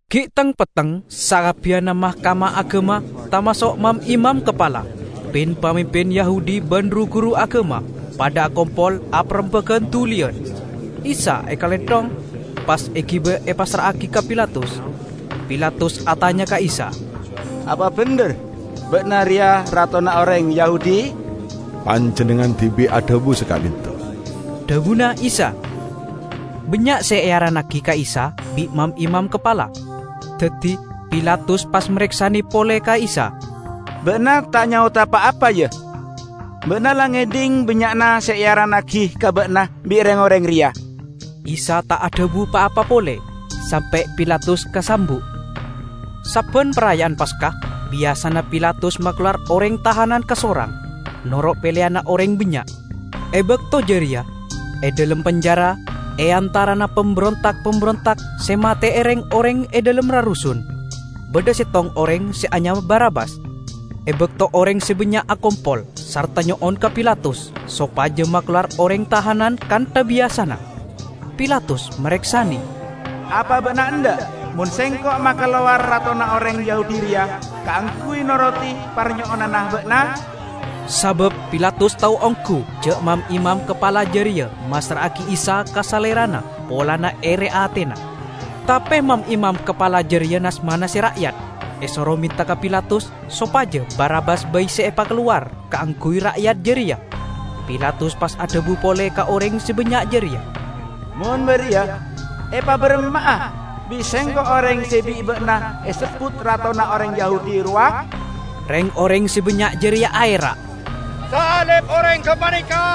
Gi' teng-petteng sakabbiyanna Mahkamah Agama tamaso' mam-imam kapala, pin-pamimpin Yahudi ban ru-guru agama padha akompol aparembagan duliyan. Isa ekalenthong, pas egiba epassra'agi ka Pilatus. Pilatus atanya ka Isa, "Apa bendher ba'na reya ratona oreng Yahudi?" "Panjennengngan dibi' adhabu saka'dhinto," dhabuna Isa. Bannya' se earannagi ka Isa bi' mam-imam kapala, daddi Pilatus pas mareksane pole ka Isa, "Ba'na ta' nyaoda pa-apa, ya? Ba'na la ngedhing bannya'na se earannagi ka ba'na bi' reng-oreng reya!" Isa ta' adhabu pa-apa pole, sampe' Pilatus kasambu'. Sabban Paraya'an Paska, biyasana Pilatus makalowar oreng tahanan kasorang, noro' peleyanna oreng bannya'. E bakto jareya, e dhalem penjara, e antarana pamberonta'-pamberonta' se mate'e reng-oreng e dhalem rarusun, badha settong oreng se anyama Barabbas. E bakto oreng se bannya' akompol sarta nyo'on ka Pilatus sopaja makalowar oreng tahanan kantha biyasana, Pilatus mareksane, "Apa ba'na endha' mon Sengko' makalowar ratona oreng Yahudi reya kaangguy norodi parnyo'onanna ba'na?" Sabab Pilatus tao onggu ja' mam-imam kapala jareya massra'agi Isa ka salerana polana ere atena. Tape mam-imam kapala jareya nas-manase ra'yat esoro menta ka Pilatus sopaja Barabbas bai se epakalowar kaangguy ra'yat jareya. Pilatus pas adhabu pole ka oreng se bannya' jareya, "Mon bariya, epabaramma'a bi' sengko' oreng se bi' ba'na esebbut ratona oreng Yahudi rowa?" Reng-oreng se bannya' jareya aera', "Salib oreng gapaneka!"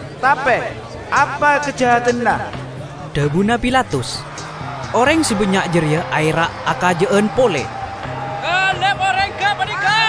"Tape apa kajahadanna?" dhabuna Pilatus. Oreng se bannya' jareya aera' akaja'an pole, "Salib oreng gapaneka!"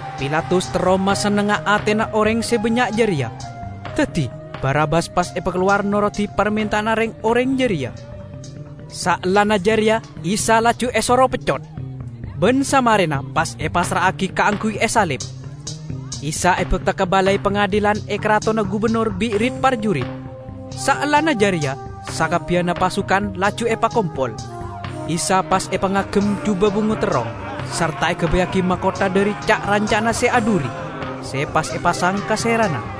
Pilatus terro masennengnga atena oreng se bannya' jareya, daddi Barabbas pas epakalowar norodi parmenta'anna reng-oreng jareya. Saellana jareya Isa laju esoro peccot, ban samarena pas epassra'agi kaangguy esalib. Isa ebakta ka balai pangadilan e karatonna gubennor bi' rit-parjurit. Saellana jareya sakabbiyanna pasukan laju epakompol. Isa pas epangagem juba bungo terrong, sarta egabayyagi makotha dhari ca'-ranca' se adhuri, se pas epasang ka serana.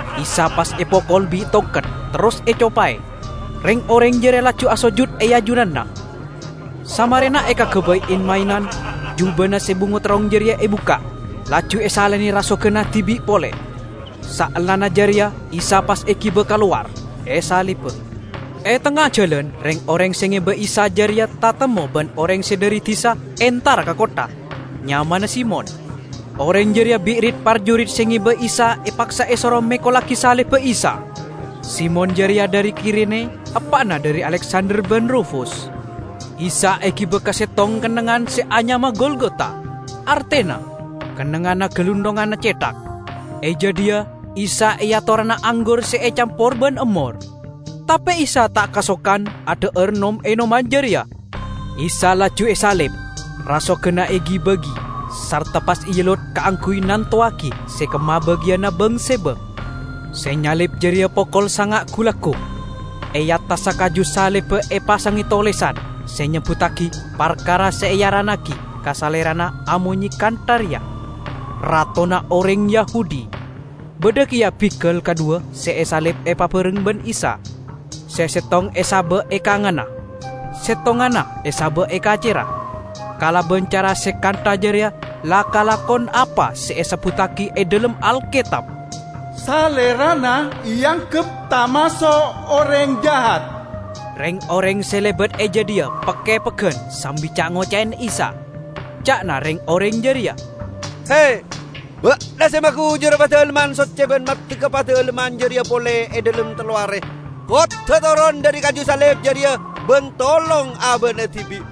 Isa pas epokol bi' tongket, terros ecopae; reng-oreng jareya laju asojud e ajunanna. Samarena ekagabay en-maenan, jubana se bungo terrong jareya ebukka', laju esalene rasoganna dibi' pole. Saellana jareya Isa pas egiba kalowar, esaliba. E tengnga jalan reng-oreng se ngeba Isa jareya tatemmo ban oreng se dhari disa entara ka kottha; nyamana Simon. Oreng jareya bi' rit-parjurit se ngeba Isa epaksa esoro mekollagi salibba Isa. (Simon jareya dhari Kirene, eppa'na dhari Aleksander ban Rufus.) Isa egiba ka settong kennengngan se anyama Golgota, artena "Kennengnganna Galunthonganna Cethak". E jadhiya Isa eatorana anggur se ecampor ban emmor, tape Isa ta' kasokan adha'ar nom-enoman jareya. Isa laju esalib, rasoganna egi-bagi, sarta pas eellot kaangguy nantowagi se kemma bagiyanna bang-sebang. Se nyalib jareya pokol sanga' gu-laggu. E attassa kaju salibba epasange tolesan se nyebbuttagi parkara se earannagi ka Salerana amonye kantha reya: "Ratona Oreng Yahudi". Badha keya bigal kadhuwa se esalib epabareng ban Isa; se settong e saba' e kanganna, settonganna esaba' e kacerra. [ Kalaban cara se kantha jareya la kalakon apa se esebbuttagi e dhalem Alketab: "Salerana eanggep tamaso' oreng jahat."] Reng-oreng se lebat e jadhiya pek-kepeggan sambi ca'-ngoca'e Isa. Ca'na reng-oreng jareya, "He! Ba'na se magujura Padalemman Socce ban maddegga Padalemman jareya pole e dhalem tello are! Kodda' toron dhari kaju salib jareya ban tolong aba'na dibi'!"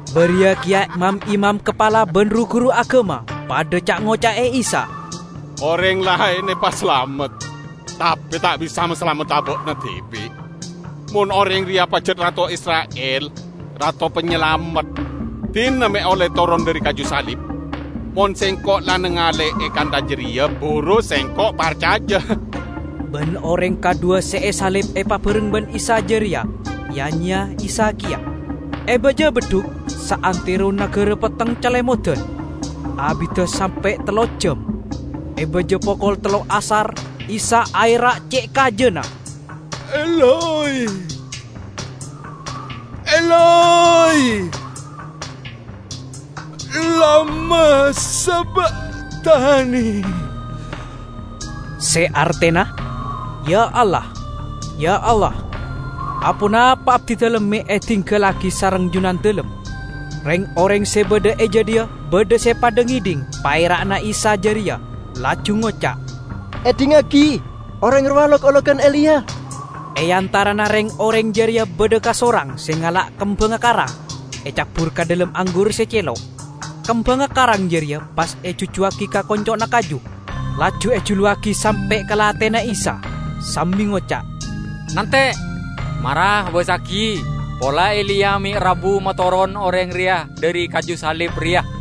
Bariya keya mam-imam kapala ban ru-guru agama padha ca'-ngoca'e Isa. "Oreng laen epasalamet, tape ta' bisa masalamet aba'na dibi'! Mon oreng reya pajat rato Isra'il, Rato Panyalamet, dina me' olle toron dhari kaju salib; mon sengko' la nangale'e kantha jareya, buru sengko' parcaja!" Ban oreng kadhuwa se esalib epabareng ban Isa jareya ya-nyeya Isa keya. E baja beddhuk saantero nagara petteng calemodan, abidda sampe' tello ejjam. E baja pokol tello' asar Isa aera' ce' kajana, "Eloi, Eloi, lama sabakhtani?" se artena, "Ya, Allah, ya, Allah, aponapa abdidalem me' edinggallagi sareng Junandalem?" Reng-oreng se badha e jadhiya badha se padha ngedhing paera'na Isa jareya, laju ngoca', "Edhingngagi, oreng rowa lok-ologan Eliya!" E antarana reng-oreng jareya badha kasorang se ngala' kembangnga karang, ecabbur ka dhalem anggur se celo'. Kembangnga karang jareya pas ejujjuwagi ka konco'na kaju, laju ejuluwagi sampe' ka lathena Isa, sambi ngoca', "Nante', mara abassagi pola Eliya me' rabu matoron oreng reya dhari kaju salib reya."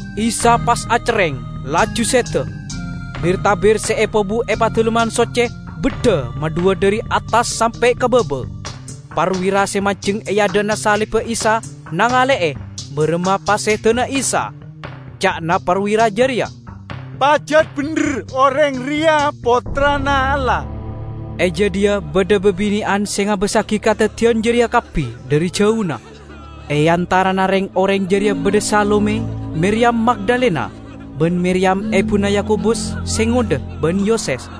Isa pas acerreng, laju seda. Bir-tabir se epobu e Padalemman Socce beddha madhuwa dhari attas sampe' ka baba. Parwira se manjeng e adha'na salibba Isa nangale'e baramma pasedana Isa. Ca'na parwira jareya, "Pajat bendher oreng reya Pottrana Allah!" E jadhiya badha babine'an se ngabassagi kadaddiyan jareya kabbi dhari jauna. E antarana reng-oreng jareya badha Salome, Miriyam Magdalena, ban Miriyam ebuna Yakobus se ngodha ban Yoses.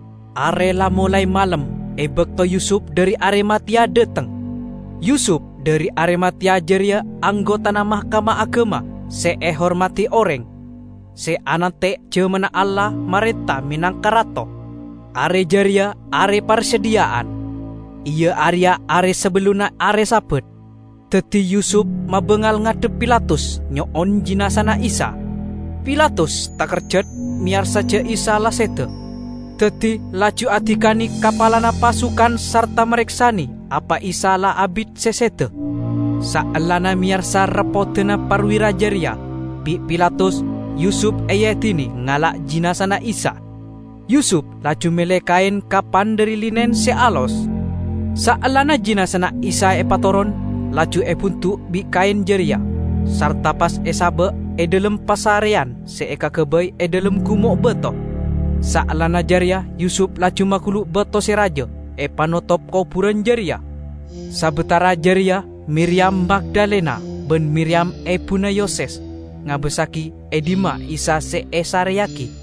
Are la molae malem e bakto Yusup dhari Arimateya dhateng. Yusup dhari Arimateya jareya anggotana Mahkamah Agama se ehormadi oreng, se anante' jamanna Allah marenta menangka Rato. Are jareya are Parsadhiya'an (iya areya are sabellunna are Sabat). Daddi Yusup mabangal ngadhep Pilatus nyo'on jinazana Isa. Pilatus takerjat meyarsa ja' Isa la seda. Daddi laju adikane kapalana pasukan sarta mareksane apa Isa la abit se seda. Saellana meyarsa reppodanna parwira jareya, bi' Pilatus Yusup eedine ngala' jinazana Isa. Yusup laju melle kaen kapan dhari linen se alos. Saellana jinazana Isa epatoron, laju ebundu' bi' kaen jareya, sarta pas esaba' e dhalem pasareyan se ekagabay e dhalem gumo' bato. Saellana jareya Yusup laju magulu' bato se raja epanotop koburan jareya. Sabatara jareya Miriyam Magdalena ban Miriyam ebuna Yoses ngabassagi e dhimma Isa se esareyagi.